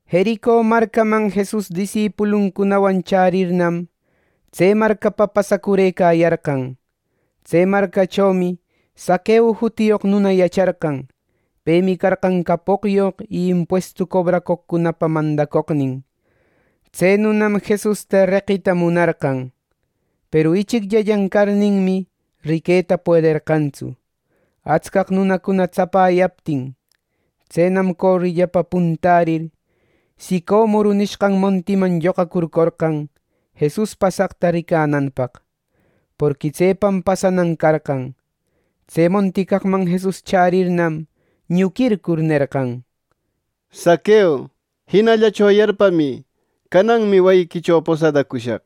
Jerico marcaman Jesus disipuluncunawan chärirnam, tse marcapa pasacurëcayarqan. Tse marcachomi Zaqueo jutiyoq nuna yacharqan. Pemi carqan capoqyoq y impuestu cobracoqcunapa mandacoqnin. Tse nunam Jesusta reqita munarqan. Peru ichicllanlla carninmi, riqueta puederqantsu, atscaq nunacuna tsapayaptin. Tsenam corillapa puntärir, sicomoro nishqan montiman lloqacurcorqan Jesus pasaqta ricananpaq; porqui tsepam pasanan carqan. Tse monti caqman Jesus chärirnam, ñuquircur nerqan: —Zaqueo, jinallacho yarpamï. Cananmi wayiquicho posadacushaq.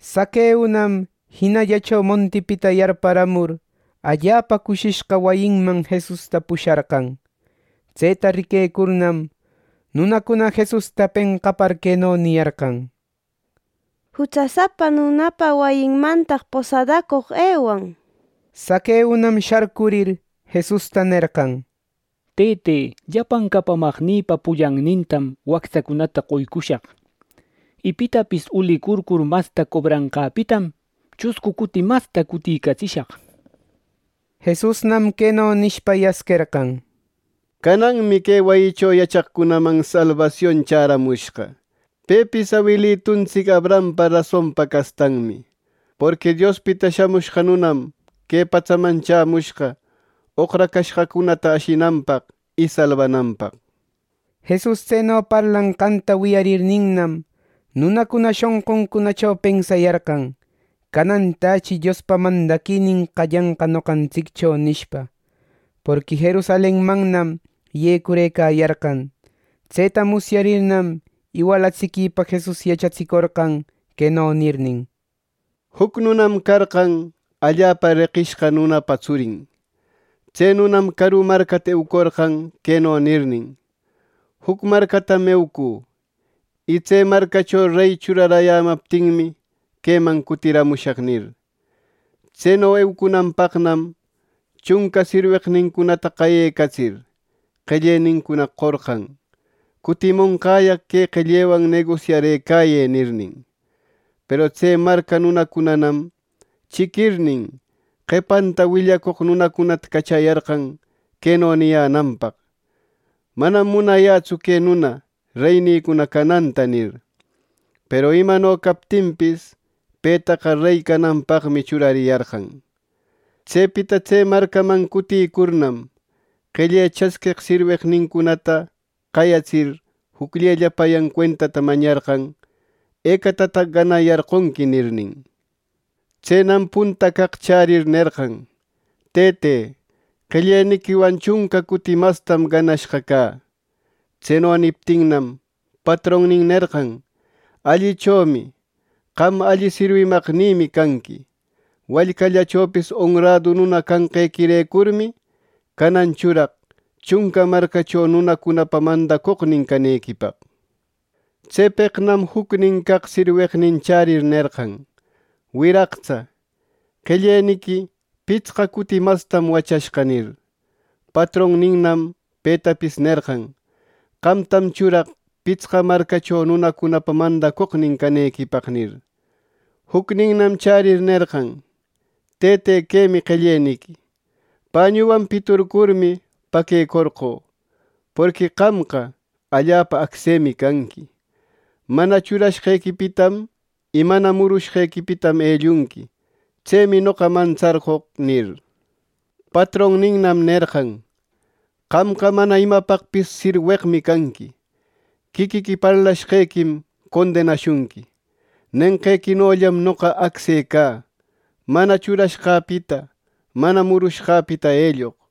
Zaqueonam jinallacho montipita yarparamur, allapa cushishqa wayinman Jesusta pusharqan. Tseta riquecurnam, nunacuna Jesusta penqapar, queno niyarqan: —¡Jutsasapa nunapa wayinmantaq posadacoq ewan! —nir. Zaqueonam sharcurir, Jesusta nerqan: —Tëte, llapan capamaqnïpa pullannintam wactsacunata qoycushaq. Y pitapis ulicurcur masta cobranqäpitam, chuscu cuti masta cutïcatsishaq. Jesusnam queno nishpa yasquerqan: —Cananmi que wayicho yachaqcunaman salbasion chämushqa, pepis awilituntsic Abrahampa rasonpa castanmi. Porqui Diospita Shamushqa Nunam que patsaman chämushqa oqracashqacunata ashinanpaq y salbananpaq. Jesus tseno parlanqanta wiyarirninnam, nunacuna shonquncunacho pensayarqan, “Canantächi Diospa mandaquinin qallanqa noqantsiccho” nishpa. Porqui Jerusalenmannam yecurëcayarqan. Tseta musyarirnam, iwalatsiquïpa Jesus yachatsicorqan queno nirnin: “Juc nunam carqan, allapa reqishqa nunapa tsurin. Tse nunam caru marcata eucorqan queno nirnin: ‘Juc marcatam eucü, y tse marcacho rey churarayämaptinmi, queman cutiramushaq’ nir. Tseno eucunanpaqnam chunca sirweqnincunata qayecatsir, qellenincuna qorqan: ‘Cutimonqäyaq que qellewan negosiarëcayë’ nirnin. “Peru tse marca nunacunanam chiquirnin, qepanta willacoq nunacunata cachayarqan queno niyänanpaq: ‘Manam munayätsu que nuna reynïcuna cananta’ nir. “Peru imano captinpis, petaqa rey cananpaqmi churariyarqan. Tsepita tse marcaman cutïcurnam, qelle chasqueq sirweqnincunata qayatsir, jucllellapayan cuentata mañarqan, ‘¿Ecatataq ganayarqonqui?’ nirnin. Tsenam punta caq chärir nerqan: ‘Tëte, qelleniquiwan chunca cuti mastam ganashqa cä.’ Tseno niptinnam, patronnin nerqan, ‘Allichomi. Qam alli sirwimaqnïmi canqui. Wallcallachopis onradu nuna canqequirecurmi, canan churaq chunca marcacho nunacunapa mandacoqnin canequipaq.’ Tsepeqnam jucnin caq sirweqnin chärir nerqan, ‘Wiraqtsa, qelleniqui pitsqa cuti mastam wachashqa’ nir. Patronninnam petapis nerqan, ‘Qamtam churaq pitsqa marcacho nunacunapa mandacoqnin canequipaq’ nir. “Jucninnam chärir nerqan, ‘Tëte, quemi qelleniqui. Pañuwan piturcurmi, paquecorqö. Porqui qamqa allapa acsemi canqui. Mana churashqequipitam y mana murushqequipitam ellunqui. Tsemi noqa mantsarqoq’ nir. Patronninnam nerqan: ‘¡Qamqa mana imapaqpis sirweqmi canqui! Quiquiqui parlashqequim condenashunqui. Nenqequinollam noqa acse cä, mana churashqäpita mana murushqäpita elloq.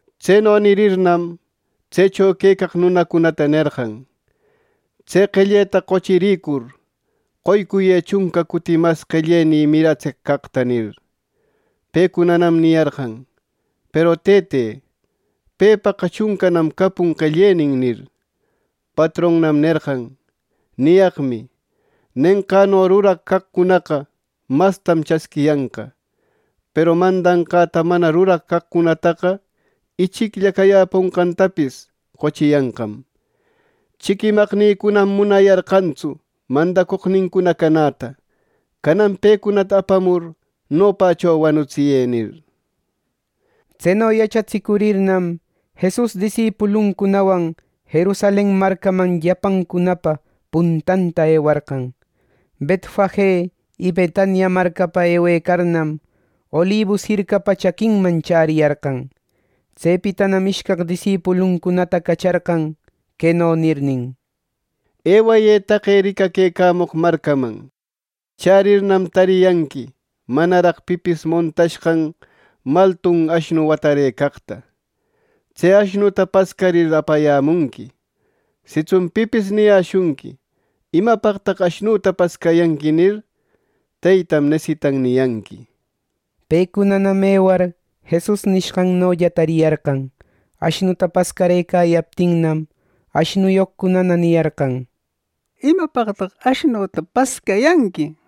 Tseno nirirninnam, tsecho quecaq nunacunata nerqan, ‘Tse qelleta qochirïcur, qoycuyë chunca cuti mas qellenï miratseq caqta’ nir. Pecunanam niyarqan, ‘Peru Tëte, pepaqa chuncanam capun qellenin’ nir. Patronnam nerqan, ‘Niyaqmi: Nenqäno ruraq caqcunaqa mastam chasquiyanqa; peru mandanqäta mana ruraq caqcunataqa, ichiclla cayäponqantapis qochiyanqam. Chiquimaqnïcunam munayarqantsu mandacoqnincuna canäta. Canan pecunata apamur nopächo wanutsiyë’ nir.” Tseno yachatsïcurirnam, Jesus disipuluncunawan Jerusalen marcaman llapancunapa puntanta ewarqan. Betfage y Betania marcapa ewecarnam, Olibus jircapa chaquinman chäriyarqan. Tsepitanam ishcaq disipuluncunata cacharqan, queno nirnin: —Ewayë taqe ricaquecamoq marcaman. Chärirnam, tariyanqui manaraq pipis montashqan maltun ashnu watarëcaqta. Tse ashnuta pascarir apayämunqui. Sitsun pipis niyäshunqui ‘¿Imapaqtaq ashnuta pascayanqui?’ nir, ‘Teytam nesitan’ niyanqui. Pecunanam ewar Jesus nishqannolla tariyarqan. Ashnuta pascarëcayaptinnam, ashnuyoqcuna niyarqan: —¿Imapaqtaq ashnüta pascayanqui? —nir.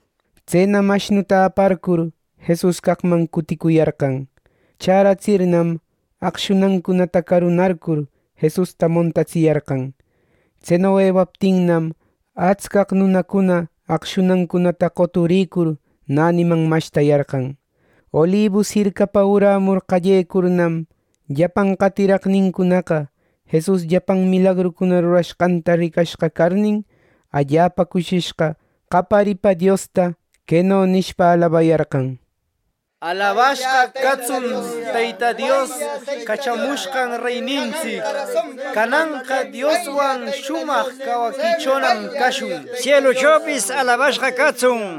Tsenam ashnuta aparcur Jesus caqman cuticuyarqan. Chäratsirnam, aqshunancunata carunarcur Jesusta montatsiyarqan. Tseno ewaptinnam, atscaq nunacuna aqshunancunata qoturicur näniman mashtayarqan. Olibus jircapa urämur qallecurnam, llapan qatiraqnincunaqa Jesus llapan milagrucuna rurashqanta ricashqa carnin, allapa cushishqa qaparipa Diosta, queno nishpa alabayarqan: —¡Alabashqa catsun Teyta Dios cachamushqan reynintsic! ¡Cananqa Dioswan shumaq cawaquichonam cashun! ¡Sieluchopis alabashqa catsun!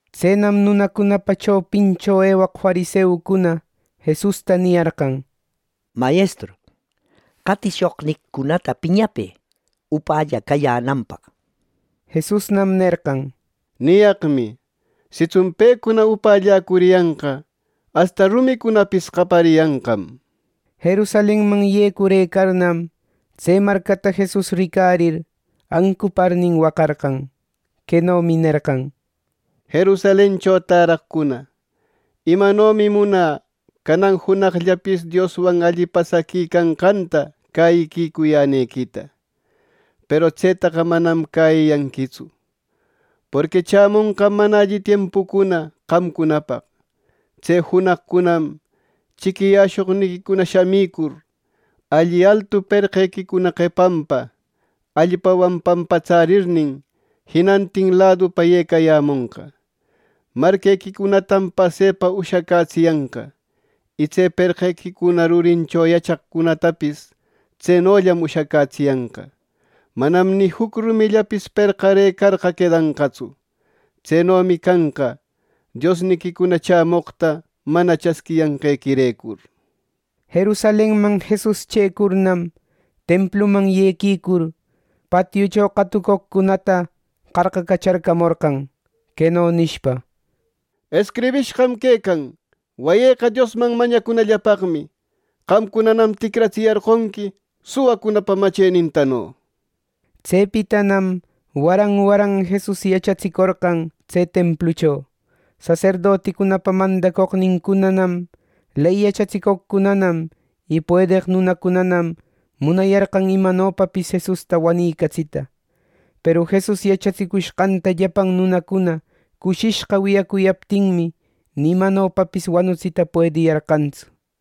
Tsenam nunacunapa chopincho ewaq fariseucuna Jesusta niyarqan: —Mayestru, qatishoqniquicunata piñapë upälla cayänanpaq. Jesusnam nerqan: —Niyaqmi: Sitsun pecuna upällacuriyanqa, asta rumicunapis qapariyanqam. Jerusalenman yecurëcarnam, tse marcata Jesus ricarir, ancuparnin waqarqan. Quenomi nerqan: —Jerusalencho täraqcuna, ¡imanomi munä canan junaqllapis Dioswan alli pasaqui canqanta cäyicuyänequita, peru tsetaqa manam cäyiyanquitsu! Porqui chämonqam mana alli tiempucuna qamcunapaq. Tse junaqcunam chiquiyäshoqniquicuna shamicur, alli altu perqequicuna qepanpa allpawan pampatsärirnin, jinantin ladupa yecayämonqa. Marquequicunatam pasepa ushacätsiyanqa, y tse perqequicuna rurincho yachaqcunatapis tsenollam ushacätsiyanqa. Manam ni juc rumillapis perqarëcarqa quedanqatsu. Tsenomi canqa, Diosniquicuna chämoqta mana chasquiyanqequirecur. Jerusalenman Jesus chëcurnam, templuman yequicur, patiucho qatucoqcunata qarqacacharcamorqan, queno nishpa: —Escribishqam quecan ‘Wayïqa Diosman mañacunallapaqmi.’ Qamcunanam ticratsiyarqonqui suwacunapa machenintano. Tsepitanam waran waran Jesus yachatsicorqan tse templucho. Saserdoticunapa mandacoqnincunanam, ley yachatsicoqcunanam y puedeq nunacunanam munayarqan imanopapis Jesusta wanicatsita. Peru Jesus yachatsicushqanta llapan nunacuna cushishqa wiyacuyaptinmi, ni imanopapis wanutsita puediyarqantsu.